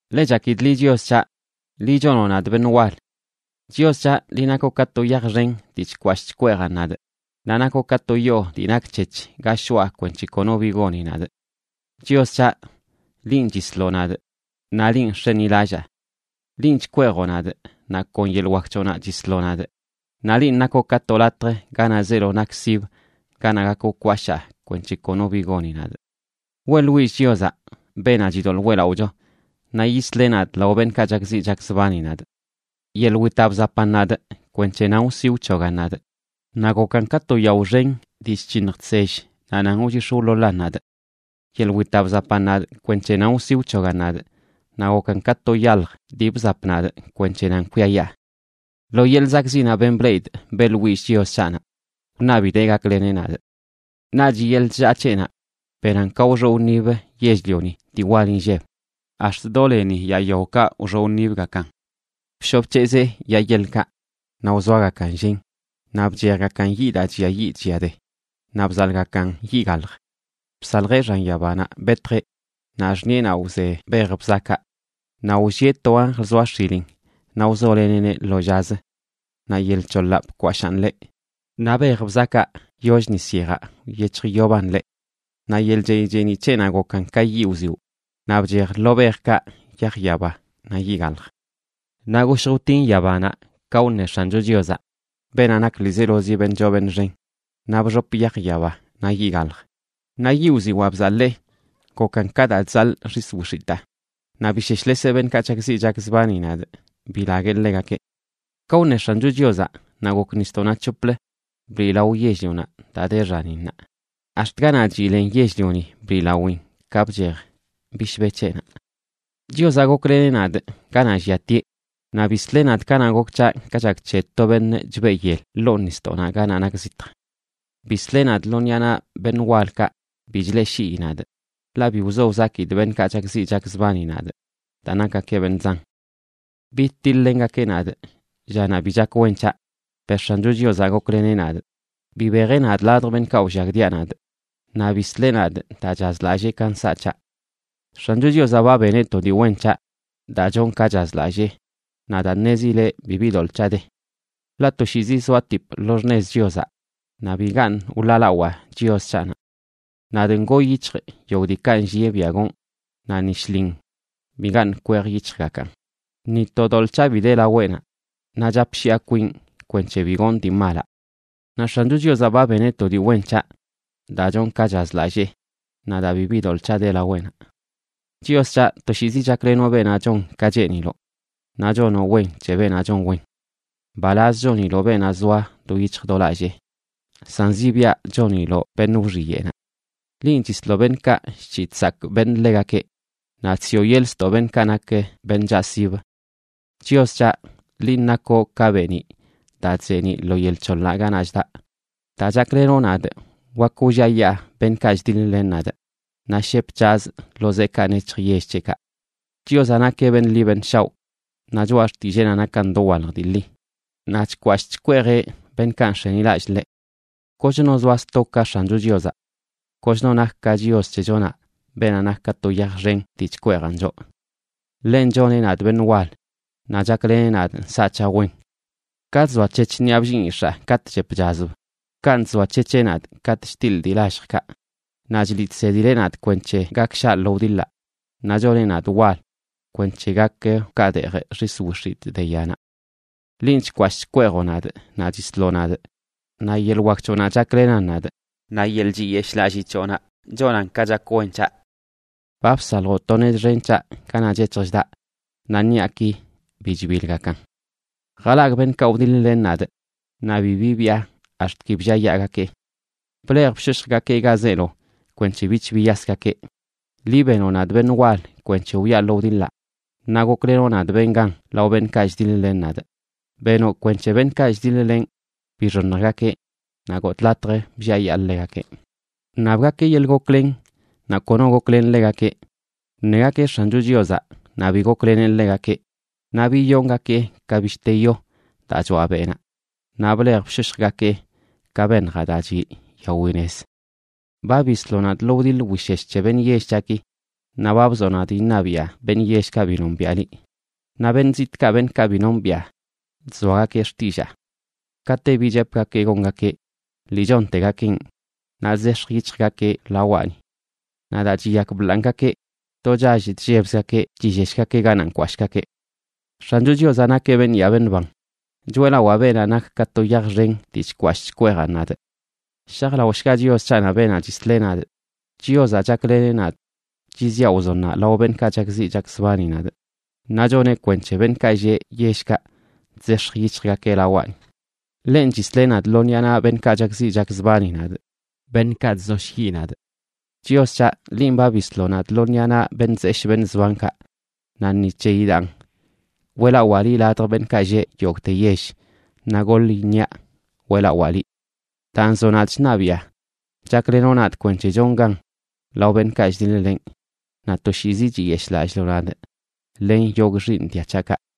Ḻe chakidꞌ liꞌ, Chios c̱haꞌ. Liꞌ chonoꞌ nadꞌ beṉꞌ wal. Chios c̱haꞌ, liꞌ nakoꞌ ka to yaj xen dii chkwashꞌ chkweejan nadꞌ, naꞌ nakoꞌ ka to yoo dii nakc̱hec̱h ga shoꞌa kwenc̱he kono bi goni nadꞌ. Chios c̱haꞌ, linꞌ chisloꞌ nadꞌ, naꞌ linꞌ nx̱enilallaa. Linꞌ chkweejoꞌ nadꞌ, naꞌ kon yeḻꞌ wak c̱hoꞌnaꞌ chisloꞌ nadꞌ. Naꞌ linꞌ nakoꞌ ka to latj ganaꞌ zeelo nak sibə ganaꞌ gak wkwashaa kwenc̱he kono bi goni nadꞌ. Weꞌḻwillꞌ Chiozaꞌ, beenaꞌ chidoḻꞌ weꞌlaꞌocho, naꞌ yisleꞌ nadꞌ lao beṉꞌkaꞌ chakziꞌ chakzbani nadꞌ. Yeḻꞌ witaꞌ bzapan nadꞌ kwenc̱he nan wsi wc̱hogan nadꞌ; naꞌ gokan ka to yao xen dii chc̱hiṉj chsell naꞌ nan wchix̱ wḻoḻan nadꞌ. Yeḻꞌ witaꞌ bzapan nadꞌ kwenc̱he nan wsi wc̱hogan nadꞌ, naꞌ gokan ka to yalj dii bzap nadꞌ kwenc̱he nan kwiayaa. Lo yeḻꞌ zakꞌziꞌnaꞌ ben bleꞌidꞌ, beꞌḻwillꞌ Chios c̱haꞌnaꞌ, wṉabidee gakleneꞌ nadꞌ. Naꞌch yeḻꞌ chllaa c̱heꞌnaꞌ benan ka wxoꞌ wṉib yell-lioni dii wal inlleb, ax̱t do leni yaa yaokaꞌ wxoꞌ wṉibgakan. Bshoꞌ bc̱hezee yaa yeḻkaꞌ naꞌ wzoagakan llen naꞌ bchejgakan yiꞌ daa chlliayiꞌ chlliade, naꞌ bzaḻꞌgakan yiꞌ galj. Bsaljeꞌ xan yabanaꞌ betjeꞌ, naꞌ xṉiꞌenaꞌ wze bej bzakaꞌ. Naꞌ wllieꞌ to anjl zoa x̱ilin:a naꞌ wzoleneꞌneꞌ lo llazə. Naꞌ yel c̱hoḻaꞌ bkwashaan ḻeꞌ, naꞌ bej bzakaꞌ yoll nis yejaꞌ wyec̱hjyoban ḻeꞌ. Naꞌ yeḻꞌ chey cheeniꞌ c̱heꞌnaꞌ gokan ka yiꞌ wziwꞌ naꞌ bchej lo bejkaꞌ yaj yaba naꞌ yiꞌ galj. Naꞌ goshj wtin yabanaꞌ ka wṉe X̱ancho Chiozaꞌ, beenaꞌ nak ḻizeelozi beṉꞌ choo beṉꞌ xen, naꞌ bxop yaj yaba naꞌ yiꞌ galj. Naꞌ yiꞌ wziwaa bzaḻee, gokan ka daa chzaḻꞌ xis wix̱itaa, naꞌ bisheshleseꞌ beṉꞌkaꞌ chakziꞌ chakzbani nadꞌ, bilagueꞌ ḻegakeꞌ. Ka wṉe X̱ancho Chiozaꞌ, naꞌ gok nisdoꞌnaꞌ c̱hoplə bliꞌlao yell-lionaꞌ daa de xaninnaꞌ, ax̱t ganaꞌ chiꞌ len yell-lioni bliꞌlawin ka bchej bishbe c̱heꞌnaꞌ. Chiozaꞌ gokleneꞌ nadꞌ ganaꞌ lliatieꞌ naꞌ bisleꞌ nadꞌ kanaꞌ gok c̱haꞌ ka chak c̱he to beṉꞌ chbeꞌ yel ḻoo nisdoꞌnaꞌ ganaꞌ nak zitj. Bisleꞌ nadꞌ lo ṉiꞌa naꞌ beṉꞌ walkaꞌ bi chleꞌshii nadꞌ, ḻaꞌ bi wzo wzakidꞌ beṉꞌkaꞌ chakziꞌ chakzbani nadꞌ daa nakgakeꞌ beṉꞌ zan. Bidtiḻ-lengakeꞌ nadꞌ llanaꞌ bi chak wen c̱haꞌ, per X̱ancho Chiozaꞌ gokleneꞌ nadꞌ. Bibejeꞌ nadꞌ ladj beṉꞌkaꞌ wllagdia nadꞌ. Naꞌ bisleꞌ nadꞌ daa chazlallee ka nsaꞌ c̱haꞌ. X̱ancho Chiozaꞌ ba beneꞌ to dii wen c̱haꞌ daa chonꞌ ka chazlallee, naꞌ daa ṉezileꞌ bibi doḻꞌ c̱haꞌ de. Ḻaꞌ toshiizi zoatipꞌ lo xṉez Chiozaꞌ; naꞌ bigaṉꞌ wḻaalawaa Chios c̱haꞌnaꞌ. Nadꞌ ngoo yic̱hjꞌ yogꞌ diikaꞌ nllieꞌ biaꞌ gonꞌ, naꞌ ni shlin bigaṉꞌ kwejyic̱hjgakaꞌn. Ni to doḻꞌ c̱haꞌ bi de laweꞌnaꞌ, naꞌ chapshiꞌa kwinꞌ kwenc̱he bi gonꞌ dii malaꞌ. Naꞌ X̱ancho Chiozaꞌ ba beneꞌ to dii wen c̱haꞌ daa chonꞌ ka chazlallee, naꞌ daa bibi doḻꞌ c̱haꞌ de laweꞌnaꞌ. Chios c̱haꞌ, toshiizi chaklenoꞌ beenaꞌ chon ka cheeniloꞌ, naꞌ chonoꞌ wen c̱he beenaꞌ chon wen. Mbalaz choniloꞌ beenaꞌ zoa do yic̱hj do lallee, san zibiaꞌ choniloꞌ beṉꞌ wxiyeꞌnaꞌ. Linꞌ, chisloꞌ beṉꞌkaꞌ chc̱hiꞌ chsakꞌ beṉꞌ ḻegakeꞌ, naꞌ chsiꞌo yeḻꞌ ztoꞌ beṉꞌkaꞌ nak beṉꞌ chaꞌsib. Chios c̱haꞌ, linꞌ nakoꞌ ka beeniꞌ daa chzeeniꞌ lo yel c̱hoḻaꞌ ganaꞌ chdaꞌ. Daa chaklenoꞌ nadꞌ wak wlliayaa beṉꞌkaꞌ chdiḻ-len nadꞌ, naꞌ shep c̱hazꞌ lo zeekaꞌ nec̱hj yell c̱heꞌkaꞌ. Chiozaꞌ nakeꞌ beṉꞌ ḻi beṉꞌ shaoꞌ; naꞌ choꞌa xtilleenaꞌ nakan dowalj dii ḻi. Naꞌ chkwashꞌ chkweejeꞌ beṉꞌkaꞌ nx̱enilallꞌ ḻeꞌ. Kochno zoa sto ka X̱ancho Chiozaꞌ. Kochno nak ka Chios c̱hechonaꞌ beenaꞌ nak ka to yaj xen dii chkweejan choꞌ. Ḻenꞌ choneꞌ nadꞌ beṉꞌ wal, naꞌ chakleneꞌ nadꞌ nsaꞌ c̱haꞌ wen. Ka chzoac̱hec̱h ṉiꞌa bllinꞌyix̱aa katꞌ chep chazb, kanꞌ chzoac̱hec̱heꞌ nadꞌ katꞌ chtiḻꞌ dii lalljkaꞌ. Naꞌ chliꞌ chsedileꞌ nadꞌ kwenc̱he gak shaꞌ lo wdiḻaꞌ naꞌ choneꞌ nadꞌ wal kwenc̱he gak wkaadeejꞌ xis wix̱itꞌ de yanaꞌ. Linꞌ chkwashꞌ chkweejoꞌ nadꞌ naꞌ chisloꞌ nadꞌ, naꞌ yeḻꞌ wak c̱hoꞌnaꞌ chaklenan nadꞌ. Naꞌ yeḻꞌ chiyeshꞌlallii c̱hoꞌnaꞌ chonan ka chak wen c̱haꞌ. Ba bsaljoꞌ to nez xen c̱haꞌ ganaꞌ chec̱hj chdaꞌ, naꞌ ṉiꞌaki bi chbilgakan. Jalagꞌ beṉꞌkaꞌ wdiḻ-len nadꞌ, naꞌ bi bibiꞌa ax̱t ki blliayaagakeꞌ. Blej bshoshjgakee ga zeelo kwenc̱he bich biyasgakeꞌ. Liꞌ benoꞌ nadꞌ beṉꞌ wal kwenc̱he wyaa lo wdiḻaꞌ, naꞌ goklenoꞌ nadꞌ benꞌ gan lao beṉꞌkaꞌ chdiḻ-len nadꞌ. Benoꞌ kwenc̱he beṉꞌkaꞌ chdiḻ-lenꞌ bixoṉjgakeꞌ, naꞌ gotꞌ latj blliayaa ḻegakeꞌ. Wṉabgakeꞌ yeḻꞌ goklen naꞌ kono goklen ḻegakeꞌ; wṉegakeꞌ X̱ancho Chiozaꞌ, naꞌ bi gokleneꞌ ḻegakeꞌ. Naꞌ biyongakee ka bishte yo daa choaꞌ beꞌnaꞌ, naꞌ blej bshoshjgakee ka beṉjaꞌ daa chiꞌ yawi nez. Ba bisloꞌ nadꞌ lo wdiḻ wishesh c̱he beṉꞌ yell c̱haꞌki; naꞌ ba bzoꞌ nadꞌ iṉabiꞌa beṉꞌ yellkaꞌ bi nombiaꞌ liꞌ; naꞌ beṉꞌ zitꞌkaꞌ beṉꞌkaꞌ bi nombiꞌa, chzoagakeꞌ xtillaa. Kate bi chepgakee gongakeꞌ, ḻi chontegakeꞌn, naꞌ chzex̱j yic̱hjgakeꞌ lawaꞌni. Naꞌ daa chiyakbḻanꞌgakeꞌ, do chall chllebzgakeꞌ chilleshgakeꞌ ganaꞌ nkwashꞌgakeꞌ. ¡X̱ancho Chiozaꞌ nakeꞌ beṉꞌ yaa beṉꞌ ban! ¡Choeꞌlawaa beenaꞌ nak ka to yaj xen dii chkwashꞌ chkweejan nadꞌ! ¡Shajlaoshga Chios c̱haꞌnaꞌ beenaꞌ chisleꞌ nadꞌ! Chiozaꞌ chakleneꞌ nadꞌ chiziꞌa wzonnaꞌ lao beṉꞌkaꞌ chakziꞌ chakzbani nadꞌ, naꞌ choneꞌ kwenc̱he beṉꞌkaꞌ lleꞌ yellkaꞌ chzex̱j yic̱hjeꞌkaꞌ lawaꞌni. Ḻenꞌ chisleꞌ nadꞌ lo ṉiꞌa naꞌ beṉꞌkaꞌ chakziꞌ chakzbani nadꞌ, beṉꞌkaꞌ chzoshyiꞌ nadꞌ. Chios c̱haꞌ, linꞌ ba bisloꞌ nadꞌ lo ṉiꞌa naꞌ beṉꞌ zeshꞌ beṉꞌ zbankaꞌ. Naꞌ ni c̱heyi daan weꞌlawaa liꞌ ladj beṉꞌkaꞌ lleꞌ yogꞌte yell, naꞌ goḻ iṉiaꞌ weꞌlawaa liꞌ. Daa nzoꞌ nadꞌ chṉabiꞌa, chaklenoꞌ nadꞌ kwenc̱he chonꞌ gan lao beṉꞌkaꞌ chdiḻ-lenꞌ. Naꞌ toshiizi chiyeshꞌlalliloꞌ nadꞌ len yogꞌ xiiṉ dia c̱haꞌkaꞌ.